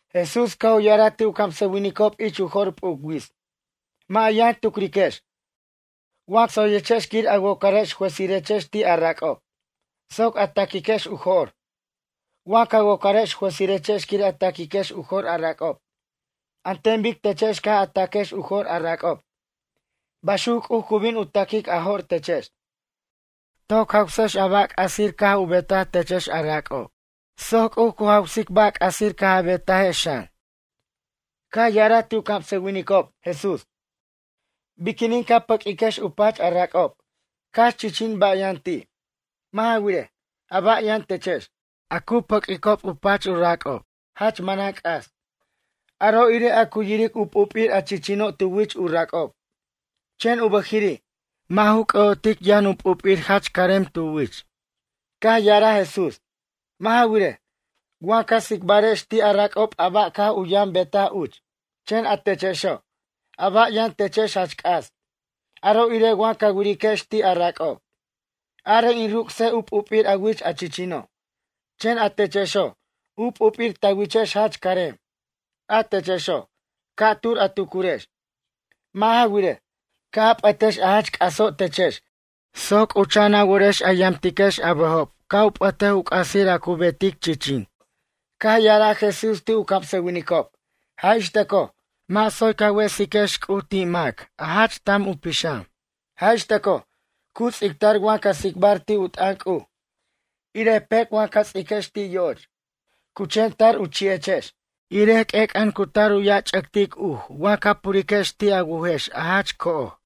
Jesús caj u ya'araj ti' u camsʌwinicob ich u jo'r p'uc wits: ―Mʌ' a yʌn tucriquechex, wa tsoyechex quir a wocar juezirechex ti' a rac'ob, soc a ta'quiquex u jo'r. Wa ca wocarex juezirechex quir a ta'quiquex u jo'r a rac'ob. An ten bic techex caj a ta'quex u jo'r a rac'ob, baxuc C'uj cu bin u ta'quic a jo'r techex. Toc jawsex a ba' c'asir caj u betaj techex a rac'ob, soc C'uj cu jawsic ba' c'asir caj a betajex xan. Caj ya'araj ti' u camsʌwinicob, Jesús: ―Biquinin ca pʌq'uiquex u pach a rac'ob, cax chichin ba' yʌn ti'? Mʌ' ja wirej, a ba' yʌn techex, a cu pʌq'uicob u pach u rac'ob, jach manan c'as. Aro' irej a cu yiric u p'up'ir a chichino' tu wich u rac'ob. Chen u bʌjiri', mʌ' ju c'ʌ'otic yʌn u p'up'ir jach carem tu wich. Caj ya'araj Jesús: ―Mʌ' ja wirej, wa ca tsicbarex ti' a rac'ob a ba' caj u yʌn betaj uch. Chen a techexo', a ba' yʌn techex jach c'as, aro' irej wa ca wa'ariquex ti' a rac'ob: “Arej in ruc'sej u p'up'ir a wich a chichino'.” Chen a techexo', u p'up'ir ta wichex jach carem. A techexo', ca'tur a tucurex. Mʌ' ja wirej, ca' a p'ʌtex a jach c'aso' techex soc c'ucha'an a worex a yamtiquex a bʌjo' ca' u p'ʌtej u c'asir a cu betic chichin. Caj ya'araj Jesús ti' u camsʌwinicob: ―Jaj ix tʌcoj, mʌ' tsoy ca wesiquex C'uj ti' mac a jach tam u pixam. Jaj ix tʌcoj, cu ts'ictar wa ca tsicbar ti' u t'ʌn C'uj, irej pec' wa ca ts'iquex ti' yo'och. Cu chen tar u chi'echex. Irej q'uec'ʌn cu tar u ya'ch'ʌctic uj wa ca puriquex ti' a wujex a jach co'oj.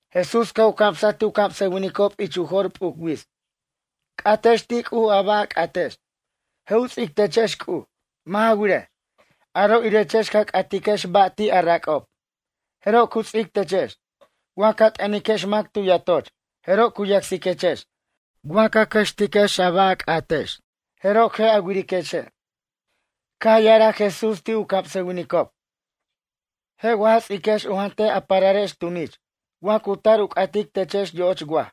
Jesús caj u camsaj ti' u camsʌwinicob ich u jo'r p'uc wits: ―C'atex ti' C'uj a ba' a c'atex. Je' u ts'ic techex C'uj. Mʌ' ja wirej, aro' irechex ca c'atiquex ba' ti' a rac'ob, jeroj cu ts'ic techex. Wa ca t'ʌniquex mac tu yatoch. Jeroj cu yacsiquechex. Wa ca cʌxtiquex a ba' a c'atex. Jeroj je' a wiriquexe'. Caj ya'araj Jesús ti' u camsʌwinicob: ―Je' wa ja ts'iquex u jantej a pararex tunich, wa cu tar u c'atic techex yo'och waj?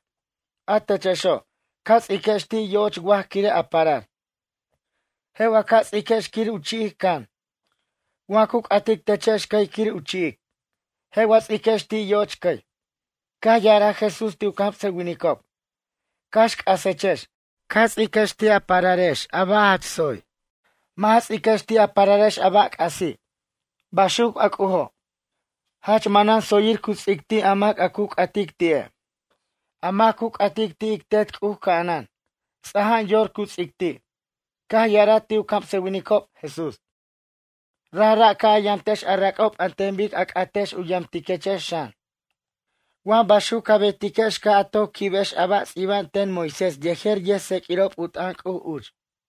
A techexo', ca ts'iquex ti' yo'och waj quire' a parar. Je' wa ca ts'iquex quir u chi'ic can, wa cu c'atic techex cʌy quir u chi'ic? Je' a ts'iquex ti' yo'och cʌy. Caj ya'araj Jesús ti' u camsʌwinicob: ―Cax c'asechex, ca ts'iquex ti' a pararex a ba' jach tsoy. Mʌ' ja ts'iquex ti' a pararex a ba' c'asi'. Baxuc a C'ujo'. Jach manan tsoyir cu ts'ic ti' a mac cu c'atic ti'e'. A mac cu c'atic ti' ic Tet C'uj ca'anan. Ts'aja'an yor cu ts'ic ti'. Caj ya'araj ti' u camsʌwinicob, Jesús: ―Rajra' ca' a yamtex a rac'ob an ten bic a c'atex u yamtiquechex xan. Wa baxuc ca betiquex caj a toc quibex a ba' ts'ibta'b ten Moisés yejer yʌjtseq'uirob u t'ʌn C'uj uch.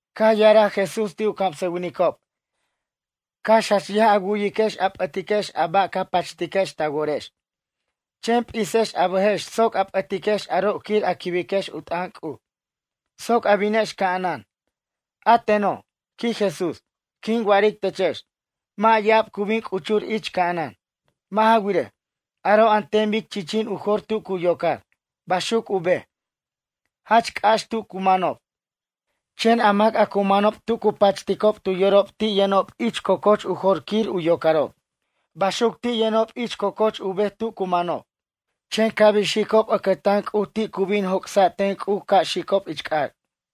Caj ya'araj Jesús ti' u camsʌwinicob: ―Cax jach yaj a wu'yiquex a p'ʌtiquex a ba' ca pachtiquex ta worex. Chen p'ixex a bʌjex soc a p'ʌtiquex aro' quir a quibex u t'ʌn C'uj, soc a binex ca'anan. A teno' ―quij Jesús―, quin wa'aric techex. Mʌ' ya'ab cu bin c'uchur ich ca'anan. Mʌ' ja wirej, aro' an ten bic chichin u jor tu cu yocar, baxuc u bej, jach c'ax tu cu manob. Chen a mac a cu manob tu cu pachticob tu yorob ti' yʌnob ich co'coch u jor quir u yocarob. Baxuc ti' yʌnob ich co'coch u bej tu cu manob. Chen ca' bin xicob ʌcʌtan C'uj ti' cu bin joc'sa' ten C'uj ca' xicob ich c'ac'.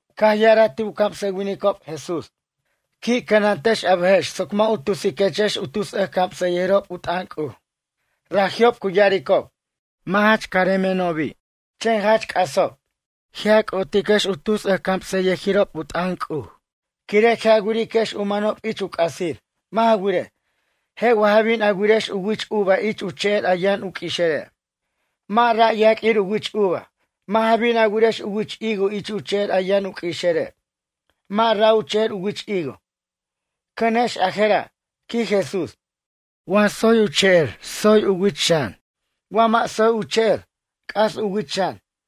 Caj ya'araj ti' u camsʌwinicob, Jesús: ―Qui' cʌnantex a bʌjex soc mʌ' u tusiquechex u tus ʌjcamsʌyʌjirob u t'ʌn C'uj. Raji'ob cu ya'aricob: “Mʌ' jach caremenobi'”, chen jach c'asob. Je' a c'ʌ'otiquex a tus ʌjcamsʌyʌjirob u t'ʌn C'uj, quire' je' a wiriquex u manob ich u c'asir. Mʌ' ja wirej, je' wa ja bin a wirex u wich uva ich u che'er a yʌn u q'ui'ixere'. Mʌ' ra' u yaq'uir u wich uva. Mʌ' ja bin a wirex u wich higo ich u che'er a yʌn u q'ui'ixere'. Mʌ' ra' u che'er u wich higo. Cʌnex a jera' ―quij Jesús―. Wa tsoy u che'er tsoy u wich xan. Wa mʌ' tsoy u che'er, c'as u wich xan.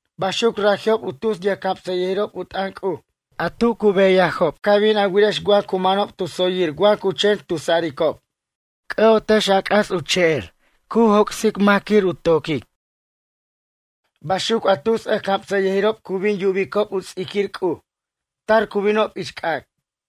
Baxuc raji'ob a tus yʌjcamsʌyʌjirob u t'ʌn C'uj. A tu cu beyajob ca bin a wirex wa cu manob tu tsoyir wa cu chen tusaricob. C'ʌ'otex a c'as u che'er, cu joc'sic mac quir u toquej. Baxuc a tus ʌjcamsʌyʌjirob cu bin yubicob u ts'iquir C'uj. Tar cu binob ich c'ac'.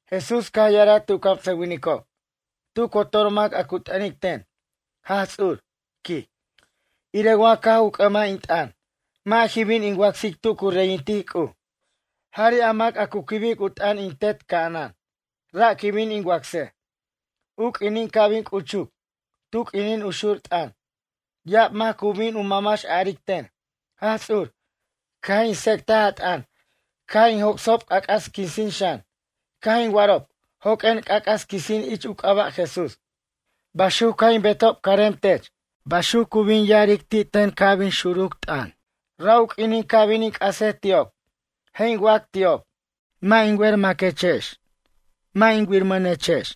Jesús caj ya'araj ti' u camsʌwinicob: ―Tu cotor mac a cu t'ʌnic ten: “Jaj Ts'ur” ―quij―, irej wa caj u c'ʌmaj in t'ʌn. Mʌ' jin bin in wacsic tu cu reyintic C'uj. Jari' a mac a cu quibic u t'ʌn in Tet ca'anan. Ra' quin bin in wacsej. U q'uinin ca' bin c'uchuc, tu q'uinin u xur t'ʌn, ya'ab mac cu bin mamax a'aric ten: “Jaj Ts'ur, caj in tsec'taj a t'ʌn. Caj in joc'sob c'ac'as quisin xan. Caj in wa'arob: Joq'uen c'ac'as quisin ich u c'aba' Jesús. Baxuc caj in betob carem tech.” Baxuc cu bin ya'aric ti' ten ca' bin xuruc t'ʌn. Ra' u q'uinin ca' bin in c'asej ti'ob. Je' in wac ti'ob: “Mʌ' jin wer maquechex. Mʌ' jin wirmʌnechex.”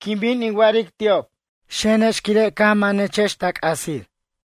Quin bin in wa'aric ti'ob: “Xenex quire' caj manex ta c'asir.”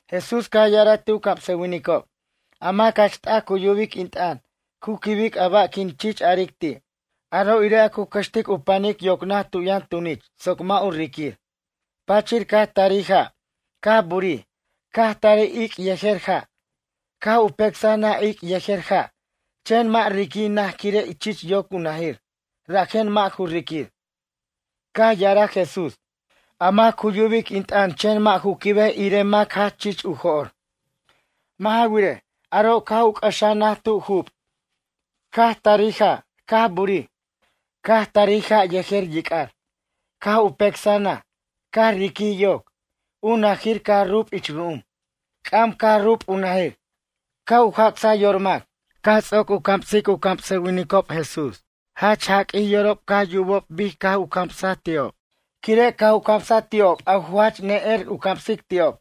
Jesús caj ya'araj ti' u camsʌwinicob: ―A mac jach t'aj cu yubic in t'ʌn, cu quibic a ba' quin chich aric ti'. Aro' irej a cu cʌxtic u panic yoc naj tu yʌn tunich soc mʌ' u riquir. Pachir caj tarij ja', caj burij, caj tarij ic' yejer ja'. Caj u pecsaj naj ic' yejer ja'. Chen mʌ' riqui' naj quire' chich yoc u najir. Rajen mʌ' ju riquir. Caj ya'araj Jesús: ―A mac cu yubic in t'ʌn chen mʌ' ju quibej irej a mac jach chich u jo'r. Mʌ' ja wirej, aro' caj u c'ʌxaj naj tu jup'. Caj tarij ja', caj burij. Caj tarij ja' yejer yic'ar. Caj u pecsaj naj. Caj riquij yoc. U najir caj rup' ich ru'um. C'am caj rup' u najir. Caj u jac'saj yor mac. Caj ts'oc u camsic u camsʌwinicob Jesús. Jach jaq'uij yorob caj yubob bic caj u camsaj ti'ob. Quire' caj u camsaj ti'ob a ju jach ne'er u camsic ti'ob.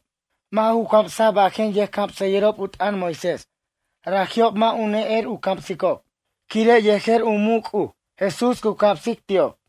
Mʌ' ju camsaj bajen yʌjcamsʌyʌjirob u t'ʌn Moisés. Raji'ob mʌ' u ne'er u camsicob. Quire' yejer u muc' C'uj Jesús cu camsic ti'ob.